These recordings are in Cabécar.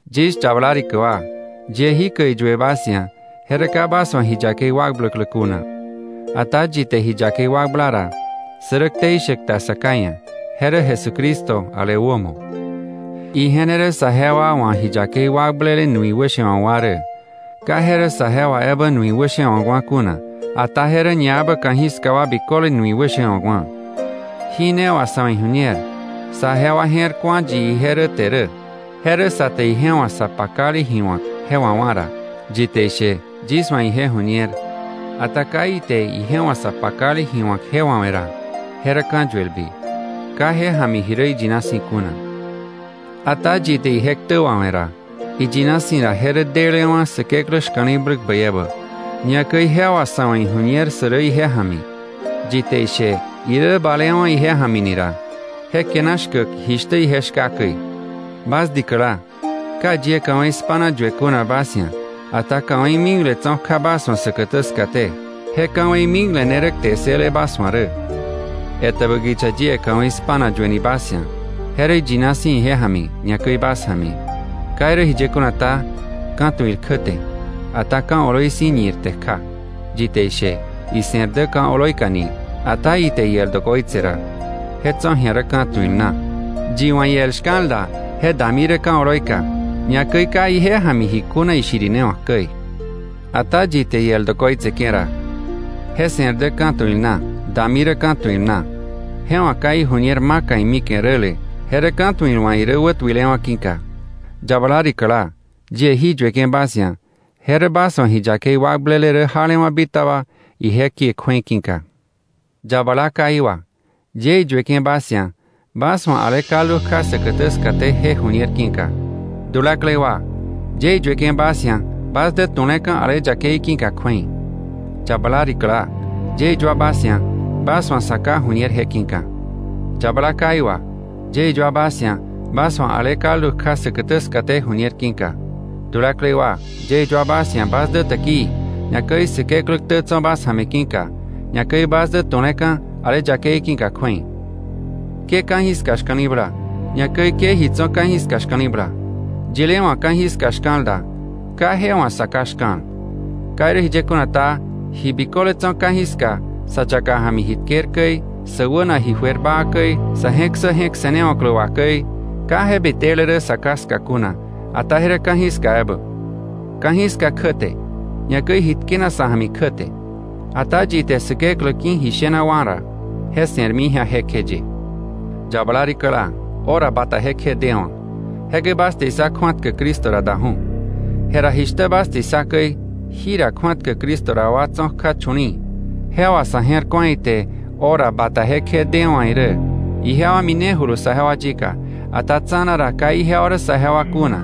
Yis yabala rikä wa, yie jikäi iyue bas ia̱, je rä ka bas wa̱ ji yakei wakbläklä kuna. Ata yi te ji yakei wakbla ra, sä rä ktei shäk ta Sa Ká ia̱, je rä Jesucristo ale wämo. Ije ne rä saje wa wa̱ ji yakei wakblele nui wäshewa̱kwa̱ rä; ka je rä saje wa ebä nui wäshewa̱kwa̱ kuna, ata je rä ñaebä ka̱jiska wa biköle nui wäshewa̱kwa̱. Jí ne wà sa̱ wa̱ iju̱ñer, saje wa je̱r ku̱a yi ije rä te rä: je rä sa te ije wa̱ sa pakale ji wa̱k je wawá̱ ra. Yi te ishe: “Yis wa̱ ije ju̱ñer”, ata ka ite ije wa̱ sa pakale ji wa̱k je wawe̱ ra, je rä ka̱yuelbi, ka je ja̱mi ji rä iyina si̱ kuna. Ata yi te ije ktä wawe̱ ra, iyina si̱ ra je rä delewa̱ Säkeklä shka̱li̱bläk bäi ebä, ñakäi je wà sa̱ wa̱ ijuñer sä rä ije ja̱mi. Yi te ishe, irä balewa̱ ije ja̱mi ni ra, je kiana shkäk jishtä ije shka käi. Bas dikäla, ka yie ka̱wei spa̱na yue kuna bas ia̱, ata ka̱wei mikle tso̱ kja bas wa̱ säkätä skaté; je ka̱wei mikle ne rä kte ssële bas wa̱ rä. Etäbä kicha yie ka̱wei spa̱na yueni bas ia̱, je rä iyina si̱ ije ja̱mi, ñakäi bas ja̱mi. Ka irä jiye kuna ta, ka̱tuil kjäte, ata ka̱ oloi si̱ ñirte kja. Yi te ishe, ise̱r dä ka̱ oloika ni, ata ite iel dokoitse ra, je tso̱ ji̱a rä ka̱tuil na. Yi wa̱ iel shka̱l da, je dami rä ka̱ oloi ka, ñakäi ka ije ja̱mi ji kuna ishirinewa̱k käi. Ata yi te iel dokoitseke̱ ra, je se̱r dä ka̱tuil na, dami rä ka̱tuil na. Je wa̱ ka iju̱ñer maka imike̱ räle, je rä ka̱tuil wa̱ irä wätuilewa̱ ki̱ka. Yabala rikäla, yie jí yueke̱ bas ia̱, je rä bas wa̱ ji yakei wakblele rä jalewa̱ bitaba ije kie kju̱ei ki̱ka. Yabala káí wa, yie iyueke̱ bas ia̱, bas wa̱ ale kaldu kja säkätä skaté je ju̱ñer ki̱ka. Dulaklei wa, yie iyueke̱ bas ia̱, bas dä tuleka̱ ale yakei ki̱ka kju̱ei. Yabala rikäla, yie iyua bas ia̱, bas wa̱ Sa Ká ju̱ñer je ki̱ka. Yabala káí wa, yie iyua bas ia̱, bas wa̱ ale kaldu kja säkätä skaté ju̱ñer ki̱ka. Dulaklei wa, yie iyua bas ia̱, bas dä täkii, ñakäi Säkeklä ktä tso̱ bas ja̱mi ki̱ka, ñakäi bas dä tu̱leka̱ ale yakei ki̱ka kju̱ei. Ke ka̱jiska shka̱li̱bla, ñakäi ke ji tso̱ ka̱jiska shka̱li̱bla. Yile wa̱ ka̱jiska shka̱l da, ka je wa̱ Sa Ká shka̱l. Ka irä jiye kuna ta, ji biköle tso̱ ka̱jiska, sa yaka ja̱mi ji tker käi, sä wäna ji juer baa käi, sa̱ je̱k ssä je̱k se̱newa̱klä wà käi, ka je bitele rä Sa Ká ska kuna, ata je rä ka̱jiska ebä. Ka̱jiska kjäte, ñakäi iji tkenak sa̱ ja̱mi kjäte; ata yi te Säkeklä ki̱ ji shena wá̱ ra, je se̱rmi ji̱a jekjeye. Yabala rikäla, hora bata jekje dewa̱. Jekäi bas te issa kju̱atkäk Cristo ra daju̱. Jera jishtä bas te issa käi, jira kju̱atkäk Cristo ra wa tso̱ kja chu̱li̱i̱; je wà sa̱ je̱r ku̱a ite hora bata jekje dewa̱ irä. Ijewa minejulu saje wa yika, ata tsa̱na ra ka ijewa rä saje wa kuna.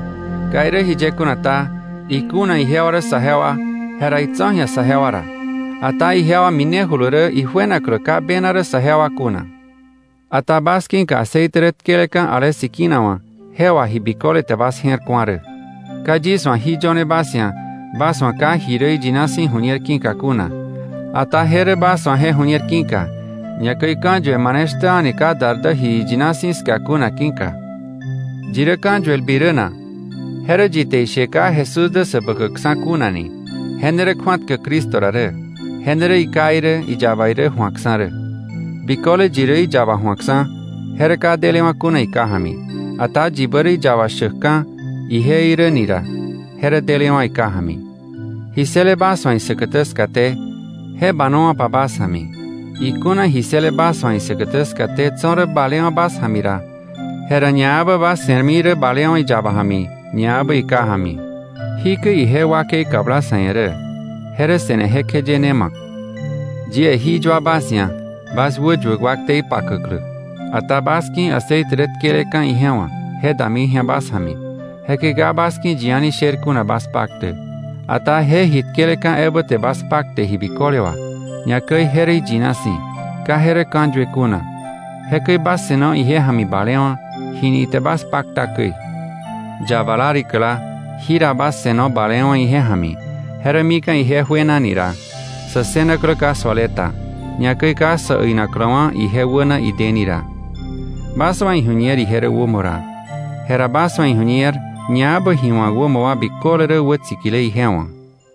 Ka irä jiye kuna ta, ikuna ijewa rä saje wa, jera itso̱ ji̱a saje wa ra. Ata ijewa minejulu rä ijuenaklä ka bena rä sajewa kuna. Ata bas ki̱ka aceite rä tkeleka̱ ale Sikina wa̱, je wà ji biköle te bas je̱r ku̱a rä. Ka yis wa̱ jí yöne bas ia̱, bas wa̱ ka ji rä iyina si̱ ju̱ñer ki̱ka kuna, ata je rä bas wa̱ je ju̱ñer ki̱ka, ñakäi ka̱yue mane shtä a̱ni ka dar dä ji iyina si̱ ska kuna ki̱ka. ¿Yi rä ka̱yuelbi rä na? Je rä yi te ishe ka Jesús dä Säbäkäkksa̱ kuna ni; je ne rä kju̱atkäk Cristo ra rä, je ne rä iKá irä iyaba irä ju̱akksa̱ rä. Biköle yi rä iyaba ju̱akksa̱, je rä ka delewa̱ kuna iKá ja̱mi. Ata yibä rä iyaba shäkka̱ ije irä ni ra, je rä delewa̱ iKá ja̱mi. Ji ssële bas wa̱ isäkätä skaté, je banowa̱pa bas ja̱mi. Ikuna ji ssële bas wa̱ isäkätä skaté tso̱ rä balewa̱ bas ja̱mi ra, jera ñaebä bas se̱rmi rä balewa̱ iyaba ja̱mi, ñaebä iKá ja̱mi. Jikäi ije wakei kabla sa̱ ia̱ rä; je rä se̱ne jekjeye ne ma̱k. Yie jí yua bas ia̱, bas wäyuäk wa ktei pakäklä. Ata bas ki̱ aceite rä tkeleka̱ ije wa̱, je dami ji̱a bas ja̱mi, jekäi ka bas ki̱ yi a̱ni sher kuna bas paktäk. Ata je ji tkeleka̱ ebä te bas pakte ji biköle wà, ñakäi je rä iyina si̱, ka je rä ka̱yue kuna; jekäi bas se̱no ije ja̱mi balewa̱, jini ite bas pakta käi. Yabala rikäla, ji ra bas se̱no balewa̱ ije ja̱mi, je rä mika̱ ije juenani ra, sä ssënaklä ka suale ta, ñakäi ka sä äinakläwa̱ ije wäna ideni ra. Bas wa̱ iju̱ñer ije rä wämo ra, jera bas wa̱ iju̱ñer ñaebä ji wämo wa̱k wa biköle rä wätsikile ije wa̱.